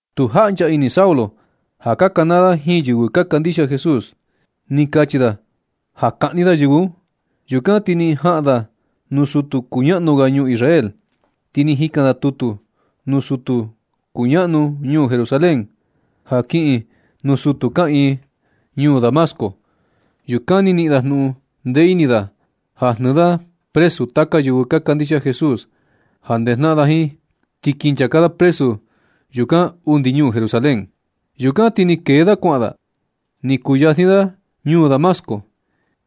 Tu jaꞌncha ini Saulo ja ka kanaa da jiin yɨvɨ ka kandixia Jesús. Ni kachi da ja kaꞌni da yɨvɨ un. Yukan ti ni jaꞌan da nuu sutu kuñaꞌnu ga ñuu Israel. Ti ni jikan da tutu nuu sutu kuñaꞌnu ñuu Jerusalén ja kiꞌin nuu sutu kaꞌiin ñuu Damasco. Yukan ni niꞌin jnuꞌun ndee ini da ja jnɨɨ da presu taka yɨvɨ ka kandixia Jesús ja ndejnaꞌan da jiin. Ti kin nchaka da presu yukan undi ñuu Jerusalén. Yukan ti ni kee da kuaꞌan da. Ni kuyajni da ñuu Damasco,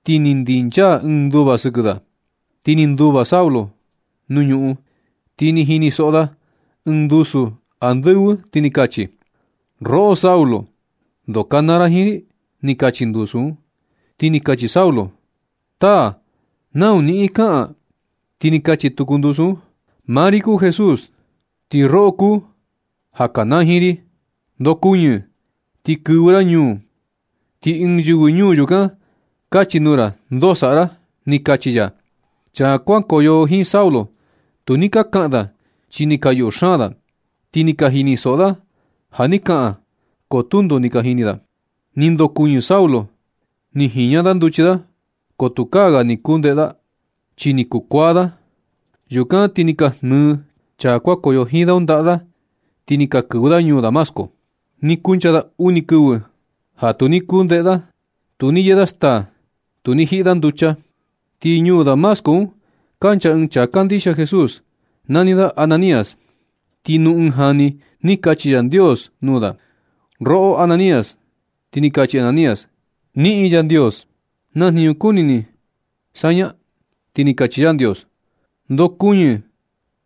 ti ni ndinchaa ɨɨn nduva sɨkɨ da. Ni nduva Saulo nuu ñuꞌun, ti ni jinisoꞌo da ɨɨn ndusu andɨvɨ ni kachi: ―Roꞌo Saulo, ¿ndoo ka kanaa ra jiin ri? ―ni kachi ndusu un. Ti ni kachi Saulo: ―Taa, ¿nau niꞌin kaꞌan? Ti ni kachi tuku ndusu un: ―Maa ri kuu Jesús, ti roꞌo kuu ja ka kanaa jiin ri. Ndokuñɨ ti kɨvɨ ra ñuu, ti ɨɨn yɨvɨ ñuu yukan kachi nuu ra ndoo saꞌa ra, ni kachi ya. Chaa kuankoyo jiin Saulo, tu ni ka kaꞌan da chi ni ka yuꞌu xaan da. Ni ka jinisoꞌo da ja ni kaꞌan, ko tundo ni ka jini da. Ni ndokuɨñɨ Saulo, ni jiña da nduchi da, ko tukaa ga ni kuu ndeꞌe da, chi ni kukuaa da. Yukan ti ni ka jnɨɨ chaa kuankoyo jiin da un ndaꞌa da, ti ni ka kɨvɨ da ñuu Damasco. Ni kuncha da uni kɨvɨ ja tu ni kuu ndeꞌe da. Tu ni yee da staa, ni tu ni jiꞌi da nducha. Ti ñuu Damasco un kancha ɨɨn chaa kandixia Jesús, nani da Ananías. Ti nuu ɨɨn jani ni kachi Yandios nuu da: ―Roꞌo Ananías. Ti ni kachi Ananías: ―Jiꞌin Yandios, ¿na jniñu kuni ni saña? Ti ni kachi Yandios: ―Ndokuɨñɨ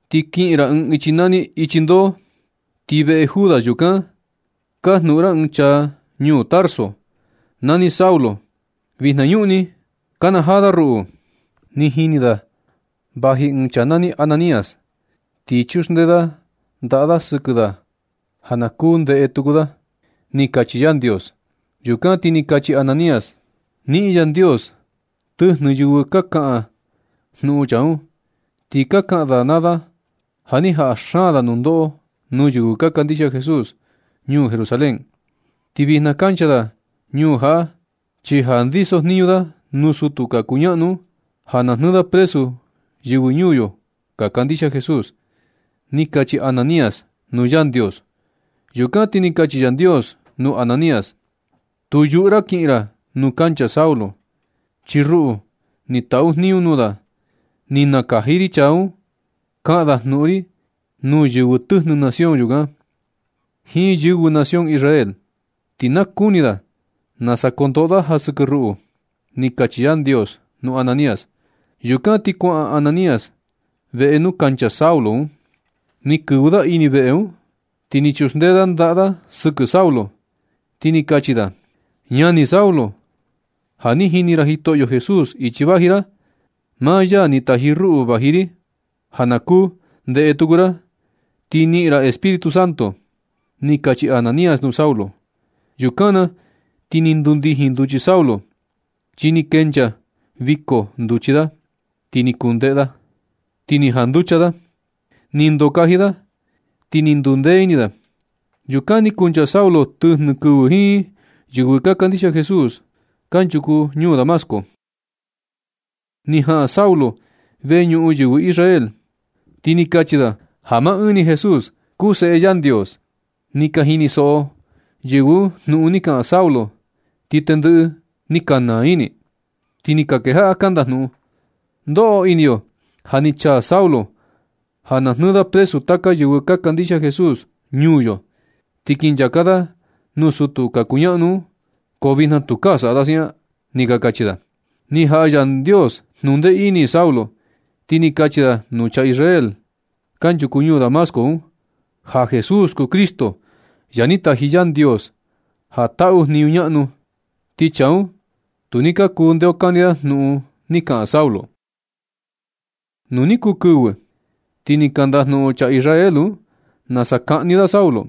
ti kiꞌin ra ɨɨn ichi nani Ichi Ndoo. Ti veꞌe Judas yukan kajnuꞌun ra ɨɨn chaa ñuu Tarso, nani Saulo. Vinañuꞌni nakanajaa da ruꞌu. Ni jini da vaji ɨɨn chaa nani Ananías, ti chuxndee da ndaꞌa da sɨkɨ da ja na kuu ndeꞌe tuku da ―ni kachi Yandios. Yukan ti ni kachi Ananías: ―Niꞌin Yandios, tɨjnɨ yɨvɨ ka kaꞌan jnuꞌun chaa un, ti ka kaꞌan da naa da ja ni jaꞌa xaan da nundoꞌo nuu yɨvɨ ka kandixia Jesús ñuu Jerusalén. Ti vijna kancha da ñuu jaꞌa, chi ja ndisojniñu da nuu sutu ka kuñaꞌnu un ja na jnɨɨ da presu yɨvɨ ñuu yo ka kandixia Jesús ―ni kachi Ananías nuu Yandios. Yukan ti ni kachi Yandios nuu Ananías: ―Tu yuꞌu ra kiꞌin ra nuu kancha Saulo, chi ruꞌu ni taꞌu jniñu nuu da. Ni nakaji ri chaa un kaꞌan da jnuꞌun ri nuu yɨvɨ tɨjnɨ nación yukan, jiin yɨvɨ nación Israel. Ti na kuni da nasa kondoꞌo da ja sɨkɨ ruꞌu ―ni kachi Yandios nuu Ananías. Yukan ti kuaꞌan Ananías veꞌe nuu kancha Saulo un. Ni kɨvɨ da ini veꞌe un, ti ni chuxndee da ndaꞌa da sɨkɨ Saulo, ti ni kachi da: ―Ñani Saulo, ja ni jini ra Jitoꞌyo Jesús ichi vaji ra. Maa ya ni taji ruꞌu vaji ri ja na kuu ndeꞌe tuku ra, ti niꞌin ra Espíritu Santo ―ni kachi Ananías nuu Saulo. Yukan na ti ni ndundijin nduchi Saulo, chi ni kenchaa viko nduchi da, ti ni kuu ndeꞌe da, ti ni janducha da. Ni ndokaji da, ti ni ndundee ini da. Yukan ni kuncha Saulo tɨjnɨ kɨvɨ jiin yɨvɨ ka kandixia Jesús kanchuku ñuu Damasco. Ni jaꞌan Saulo veñuꞌun yɨvɨ Israel, ti ni kachi da ja maa ɨɨn ni Jesús kuu Seꞌe Yandios. Ni ka jinisoꞌo yɨvɨ un jnuꞌun ni kaꞌan Saulo, ti tendɨꞌɨ ni ka naa ini, ti ni ka kejaꞌa ka ndajnuꞌun: ―Ndoꞌo ini yo ja ni chaa Saulo ja na jnɨɨ da presu taka yɨvɨ ka kandixia Jesús ñuu yo, ti kin nchaka da nuu sutu ka kuñaꞌnu un, ko vijna tukaa saꞌa da siaꞌan ―ni ka kachi da. Ni jaꞌa Yandios jnundee ini Saulo, ti ni kachi da nuu chaa Israel kanchuku ñuu Damasco un, ja Jesús kuu Cristo ja ni taji Yandios ja taꞌu jniñu ñaꞌnu. Ti chaa un tu ni ka kuu ndeokani da jnuꞌun ni kaꞌan Saulo. Nu ni kuu kɨvɨ, ti ni ka ndajnuꞌun chaa Israel un nasa kaꞌni da Saulo.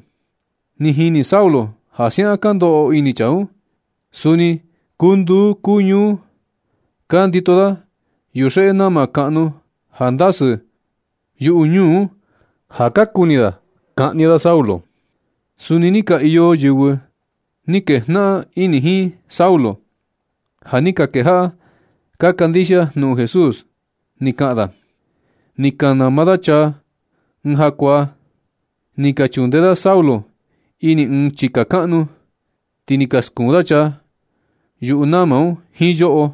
Ni jini Saulo ja siaꞌan ka ndoꞌo ini chaa un. Suni kuu nduu kuu ñuu ka ndito da yuxeꞌe nama kaꞌnu ja ndasɨ yuꞌu ñuu un ja ka kuni kaꞌni da Saulo. Suni ni ka iyo yɨvɨ ni kejnaꞌan ini jiin Saulo, ja ni ka kejaꞌa ka kandixia jnuꞌun Jesús ni kaꞌan da. Ni ka nama da chaa ɨɨn jakuaa. Ni ka chundee da Saulo ini ɨɨn chika kaꞌnu, ti ni ka skuun da chaa yuꞌu nama un jiin yoꞌo.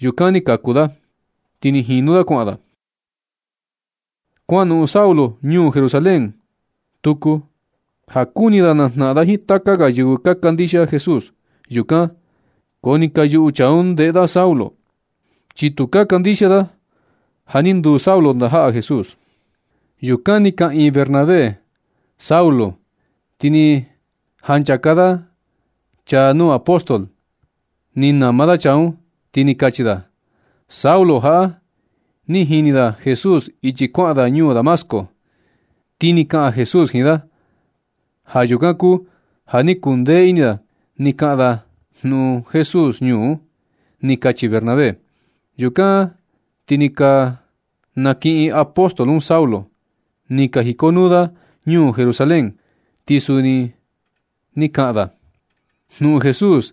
Yukan ni kaku da, ti ni jinu da kuaꞌan da. Kuanoꞌon Saulo ñuu Jerusalén tuku ja kuni da najnaꞌan da jiin taka ga yɨvɨ ka kandixia Jesús yukan, ko ni ka yuꞌu chaa un ndeꞌe da Saulo, chi tu ka kandixia da ja ni nduu Saulo ndajaꞌa Jesús. Yukan ni nakiꞌin Bernabé Saulo, ti ni janchaka da chaa nuu apóstol, ni nama da chaa un, ti ni kachi da: ―Saulo jaꞌa, ni jini da Jesús ichi kuaꞌan da ñuu Damasco, ti ni kaꞌan Jesús jiin da. Ja yukan kuu ja ni kuu ndee ini da ni kaꞌan da jnuꞌun Jesús ñuu un ―ni kachi Bernabé. Yukan ti ni ka nakiꞌin apóstol un Saulo, ni ka jikonuu da ñuu Jerusalén. Ti suni ni kaꞌan da jnuꞌun Jesús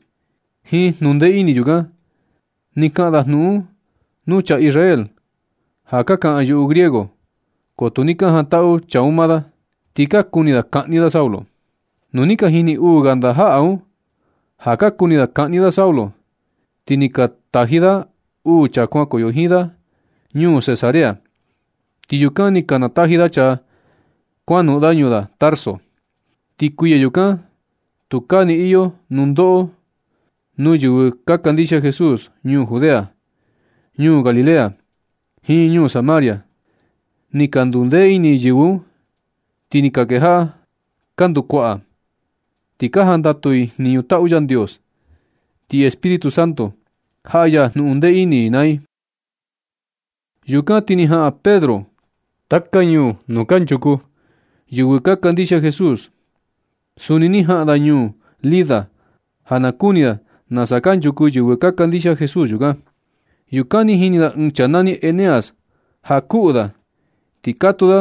jiin jnundee ini yukan. Ni kaꞌan da jnuꞌun un nuu chaa Israel ja ka kaꞌan yuꞌu griego, ko tu ni ka jantaꞌu chaa un maa da, ti ka kuni da kaꞌni da Saulo. Nu ni ka jini uu ga ndajaꞌa un ja ka kuni da kaꞌni da Saulo, ti ni ka taji da uu chaa kuankoyo jiin da ñuu Cesarea. Ti yukan ni ka nataji da chaa kuanoꞌon da ñuu da Tarso. Ti kuiya yukan, tukaa ni iyo nundoꞌo nuu yɨvɨ ka kandixia Jesús ñuu Judea, ñuu Galilea, jiin ñuu Samaria. Ni ka ndundee ini yɨvɨ un, ti ni ka kejaꞌa ka ndukuaꞌa, ti ka jandatu i jniñu taꞌu Yandios. Ti Espíritu Santo, jaꞌa ya jnundee ini i naa i. Yukan ti ni jaꞌan Pedro taka ñuu nuu kanchuku yɨvɨ ka kandixia Jesús. Suni ni jaꞌan da ñuu Lida ja na kuni da nasa kanchuku yɨvɨ ka kandixia Jesús yukan. Yukan ni jini da ɨɨn chaa nani Eneas ja kuꞌu da. Ni katuu da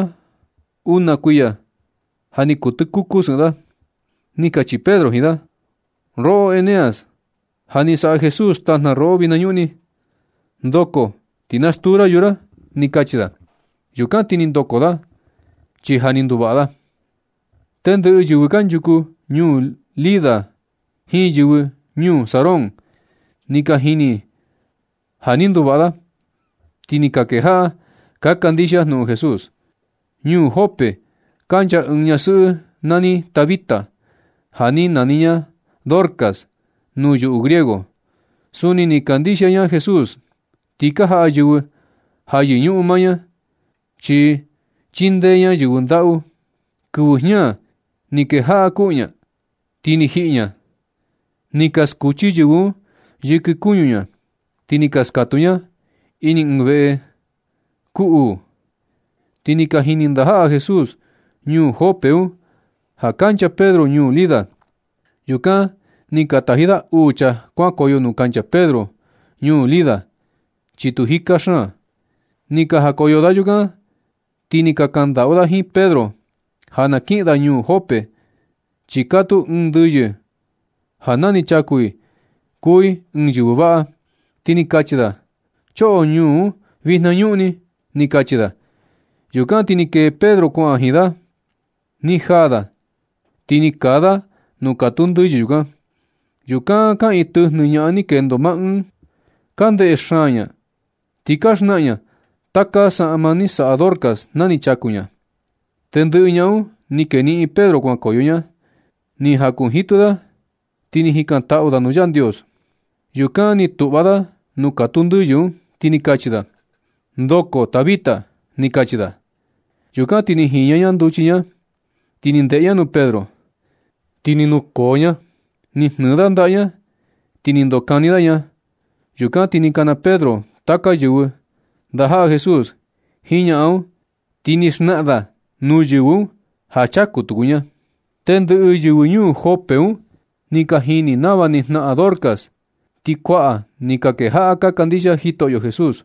una kuiya ja ni kuu tɨkuku sɨꞌɨn da. Ni kachi Pedro jiin da: ―Roꞌo Eneas, ja ni saꞌa Jesús tajna roꞌo vijnañuꞌni. Ndoko ti na stuu ra yuu ra ―ni kachi da. Yukan ti ni ndoko da, chi ja ni nduvaꞌa da. Tendɨꞌɨ yɨvɨ kanchuku ñuu Lida jiin yɨvɨ ñuu Sarón, ni ka jini ja ni nduvaꞌa da, ti ni ka kejaꞌa ka kandixia jnuꞌun Jesús. Ñuu Jope kancha ɨɨn ñasɨꞌɨ nani Tabita, ja ni nani ña Dorcas nuu yuꞌu griego. Suni ni kandixia ña Jesús, ti ka jaꞌa yɨvɨ ja yɨñuꞌun maa ña, chi chindee ña yɨvɨ ndaꞌu. Kɨvɨ jña ni kejaꞌa kuꞌu ña, ti ni jiꞌi ña. Ni ka skuchi yɨvɨ un yɨkɨ kuñu ña, ti ni ka skatuu ña ini ɨɨn veꞌe kuu uu. Ti ni ka jini ndajaꞌa Jesús ñuu Jope un ja kancha Pedro ñuu Lida. Yukan ni ka taji da uu chaa kuankoyo nuu kancha Pedro ñuu Lida, chi tu jika xaan. Ni ka jakoyo da yukan, ti ni ka kaꞌan ndaꞌu da jiin Pedro ja na kiꞌin da ñuu Jope, chi katuu ɨɨn ndɨyɨ ja na nɨ chaku i, kuu i ɨɨn yɨvɨ vaꞌa. Ti ni kachi da: ―Choꞌo ñuu un vijnañuꞌni ―ni kachi da. Yukan ti ni kee Pedro kuaꞌan da jiin da. Ni jaa da, ti ni kaa da nuu katuu ndɨyɨ yukan. Yukan kaꞌiin tɨjnɨ ñaꞌan ni kendo maa ɨɨn ka ndeꞌe xaan ña, ti ni ka xnaꞌan ña taka saꞌma ni saꞌa Dorcas na ni chaku ña. Tendɨꞌɨ ñaꞌan un ni keniꞌin Pedro kuankoyo ña, ni jakunjitɨ da ti ni jikantaꞌu da nuu Yandios. Yukan ni tuꞌva da nuu katuu ndɨyɨ un, ti ni kachi da: ―Ndoko Tabita ―ni kachi da. Yukan ti ni jiña ña nduchi ña. Ni ndeꞌe ña nuu Pedro, ti ni nukoo ña. Ni jnɨɨ da ndaꞌa ña, ti ni ndokani da ña. Yukan ti ni kana Pedro taka yɨvɨ, ndajaꞌa Jesús jiin ñaꞌan un, ti ni xnaꞌan da nuu yɨvɨ un ja chaku tuku ña. Tendɨꞌɨ yɨvɨ ñuu Jope un ni ka jini nava ni jnaꞌan Dorcas, ti kuaꞌa ni ka kejaꞌa ka kandixia Jitoꞌyo Jesús.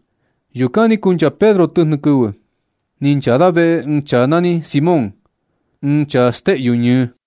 Yukan ni kuncha Pedro tɨjnɨ kɨvɨ, ni nchaa da veꞌe ɨɨn chaa nani Simón, ɨɨn chaa steꞌyu ñɨɨ.